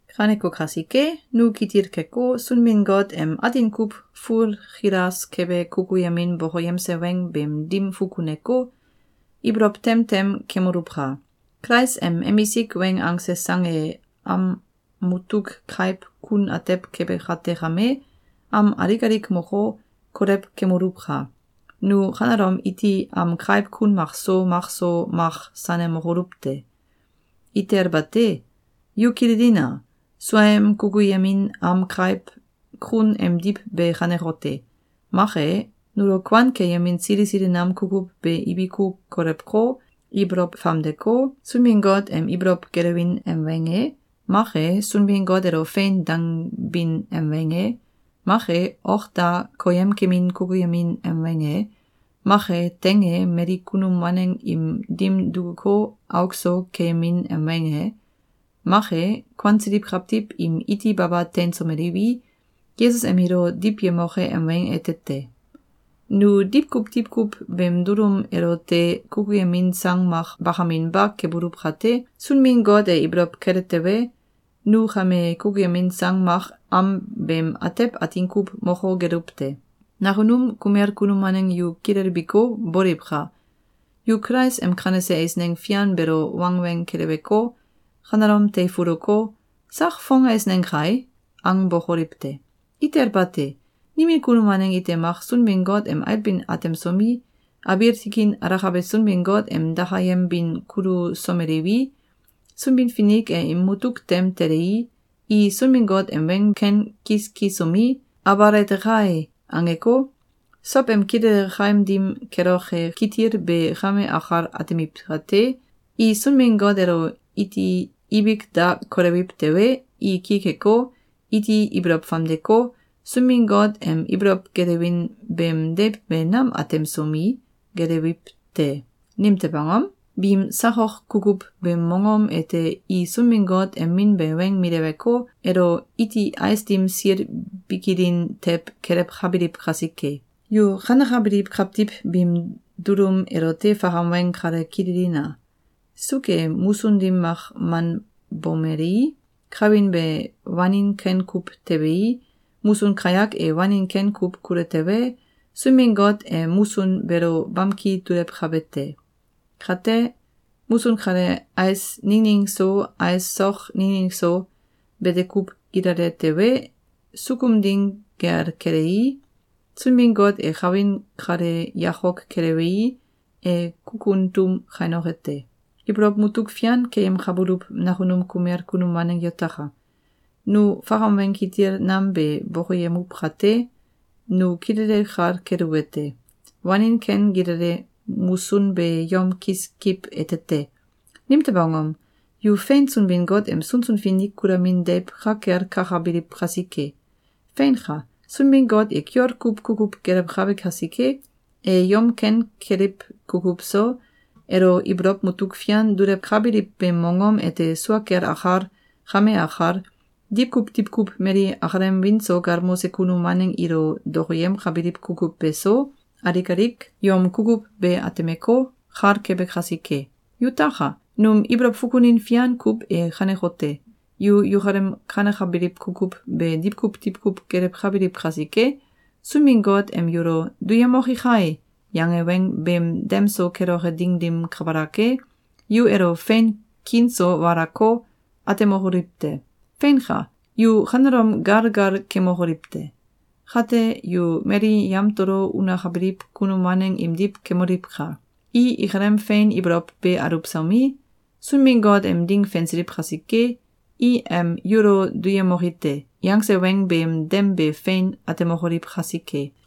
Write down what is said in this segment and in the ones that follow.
Kaneko kasike, nu kitil keko, Sunbin-Got em atin kuw fulkilas kebe kukuyemin bokoyemse weng beem dim fukuneko, ibolow tem tem kemoluwka! Kulais em emisik weng angse sang e am mutuk kaiw kun atew kebe kate kame, am alik alik moko, kolew kemoluwka! Nu kanelom iti am kaiw kun makso makso mak sanemokoluw te! Itel bate! Yu kililina! Suaem kukuyemin am kaiw kun emdiw be kanekote: Mak e, nulo kuan keyemin sili sili nam kukuw be ibiku kolewko, ibolow famdeko, Sunbin-Got em ibolow gelewin em weng e, mak e, Sunbin-Got elo “Fein!”, dangbin em weng e, mak e, ok da koyemkemin kukuyemin em weng e, mak e, teing e mali kunum waneng im dim dukuko, auk so keyemin em weng e, mak e, kuansiliw kawtiw im iti baba teinsomeliwi, Yesus em ilo diwyemoke em weng ete te. Nu diwkuw diwkuw beem dulum elote kukuyemin sang mak bakaminba kebuluw kate, Sunbin-Got e ibolow kele tewe, nu kame kukuyemin sang mak am beem atew atin kuw moko geluw te. Nakunum kumel kunum waneng yu kilelbiko, boliwka! Yu Kulais em kanese eisneng fian beelo wangweng keleweko, kanelom teifuluko, “Sak fong eisneng kai!”, angbokoliw te! Itel bate! Nimin kunum waneng ite mak Sunbin-Got em ailbin atemsomi, abiil tikin alakabe Sunbin-Got em dakayembin kulusomeliwi, Sunbin-Finik e im mutuk tem telei, i Sunbin-Got em weng ken kiskisomi, “Abal ete kai!”, angeko, sow em kilele kaim dim keloke kitil be kame akal atemiw kate, i Sunbin-Got elo iti ibik da kolewiw tewe, i ki keko, iti ibolow famdeko, Sunbin-Got em ibolow gelewin beem deiw be nam atemsomi, gelewiw te. Nimtew angom? Biim sakok kukuw beem mongom ete i Sunbin-Got em Min be weng mileweko, elo iti ais dim sil bikilin tew kelewkabiliw kasike. Yu kanekabiliw kawtiw biim dulum elote fakam weng kale kililina! Suuk e musun dim mak manbomelei, kawin be wanin ken kuw tebei, musun kayak e wanin ken kuw kule tewe, Sunbin-Got e musun beelo bamki dulewkabe te. Kate, musun kale ais ningning so, ais sok ningning so, bete kuw gilale tewe, sukum ding gel kelei, Sunbin-Got e kawin kale yakok kelewei, e kukun tum kainoke te. Ibolow mutuk fian keyemkabuluw nakunum kumel kunum waneng yutaka! Nu fakam weng kitil nam be bokoyemuw kate, nu kilele kal keluwete: Wanin ken gilale musun be yom kiskiw ete te. Nimtew angom? Yu fein Sunbin-Got em sunsun finik kulamin deiw ka kel kakabiliw kasike. Feinka! Sunbin-Got e kiol kuw kukuw gelewkabe kasike, e yom ken keliw kukuw so, elo ibolow mutuk fian dulewkabiliw beem mongom ete sua kel akal, kame akal, diwkuw diwkuw mali akalem wiin so galmose kunum waneng ilo dokoyemkabiliw kukuw beso, alik alik yom kukuw be atemeko, kal kebe kasike. Yutaka! Num ibolow fukunin fian kuw e kanekote: Yu yukalem kanekabiliw kukuw be diwkuw diwkuw gelewkabiliw kasike, Sunbin-Got em yulo “Duyemoki kai!”, yange weng beem dem so keloke ding dim kabalak e, yu elo fein kiin so walako, atemokoliw te. Feinka! Yu kanelom gal gal kemokoliw te! Kate, yu mali yamtolo unakabiliw kunum waneng imdiw kemoliwka! I ikalem fein ibolow be aluwsomi, Sunbin-Got em ding fensiliw kasike, i em “Yulo duyemoki te!”, yangse weng beem dem be fein atemokoliw kasike.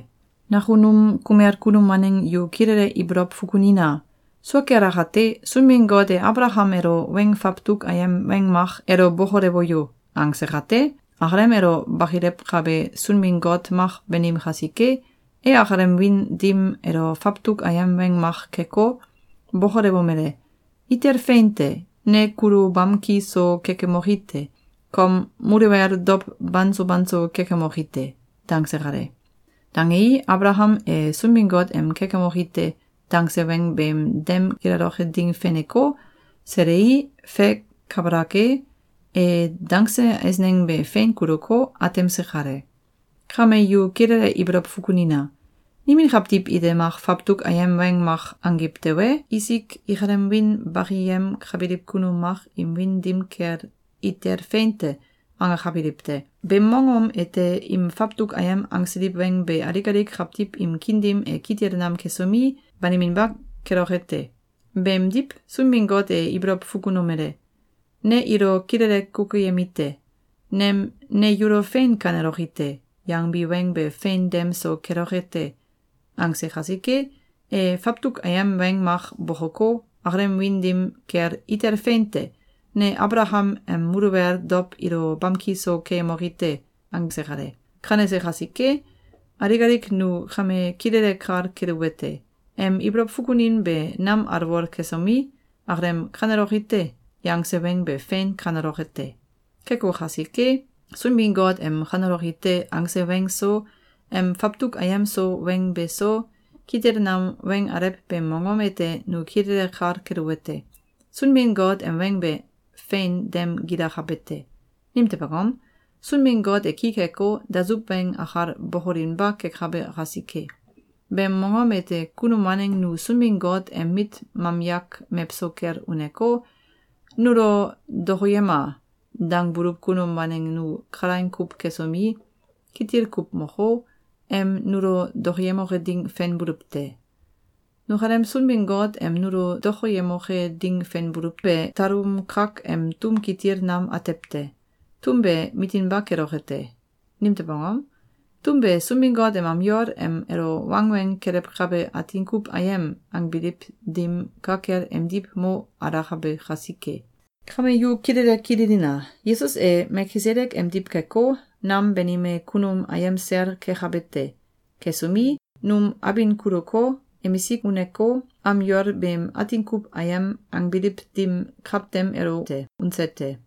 Nakunum kumel kunum waneng yu kilele ibolow fukunina! Sua kel akate, Sunbin-Got e Abalakam elo weng fawtuk ayem weng mak “Elo bokolewo yo!”, angse kate, akalem elo bakilewkabe Sunbin-Got mak banim kasike, e akalem wiin dim elo fawtuk ayem weng mak keko, bokolewomele: “Itel fein te! Ne kulo bamki so kekemoki te. Kom muluwel dow banso banso kekemoki te.”, dangse kale. Dangei, Abalakam e Sunbin-Got em “Kekemoki te!”, dangse weng beem dem gilaloke ding feneko, selei, fe kabalak e, e dangse eisneng be fein kuluko, atemse kale. Kame yu kilele ibolow fukunina! Nimin kawtiw ite mak fawtuk ayem weng mak angiw tewe, isik ikalem wiin bakiyemkabiliw kunum mak im wiin dim kel “Itel fein te!”, angakabiliw te. Beem mongom ete im fawtuk ayem angsiliw weng be alik alik kawtiw im kiin dim e kitil nam kesomi, baniminba keloke te. Beemdiw, Sunbin-Got e ibolow fukunomele: “Ne ilo kilele kukuyemite: Nem ‘Ne yulo fein kaneloki te!’, yangbi weng be fein dem so keloke te!”, angse kasike, e fawtuk ayem weng mak bokoko, akalem wiin dim kel “Itel fein te! Ne Abalakam em muluwel dow ilo bamki so keyemoki te!”, angse kale. Kanese kasike, alik alik nu kame kilele kal keluwete: Em ibolow fukunin be nam alwol kesomi, akalem “Kaneloki te!”, yangse weng be fein kaneloke te! Keko kasike, Sunbin-Got em “Kaneloki te!”, angse weng so, em fawtuk ayem so weng beso, kitil nam weng alew beem mongom ete nu kilele kal keluwete: Sunbin-Got em weng be fein dem gilakabe te. Nimtew angom? Sunbin-Got e ki keko, dasuw weng akal bokolinba kekabe kasike. Beem mongom ete kunum waneng nu Sunbin-Got em mit mamyak mewso kel uneko, “Nulo dokoyema!”, dangbuluw kunum waneng nu kalaing kuw kesomi, kitil kuw moko, em nulo dokoyemoke ding fenbuluw te. Nukalem Sunbin-Got em nulo dokoyemoke ding fenbuluw be, talum kak em tum kitil nam atew te. Tum be mitinba keloke te. Nimtew angom? Tum be Sunbin-Got em am yol em elo wangweng kelewkabe “Atin kuw Ayem!”, angbiliw dim ka kel emdiw mo alakabe kasike. Kame yu kilele kililina! Yesus e Melkisedek emdiw keko, nam banime kunum ayem sel kekabe te. Kesomi, num abin kuluko, emisik uneko, am yol beem “Atin kuw Ayem!”, angbiliw dim kawtem elote unse te.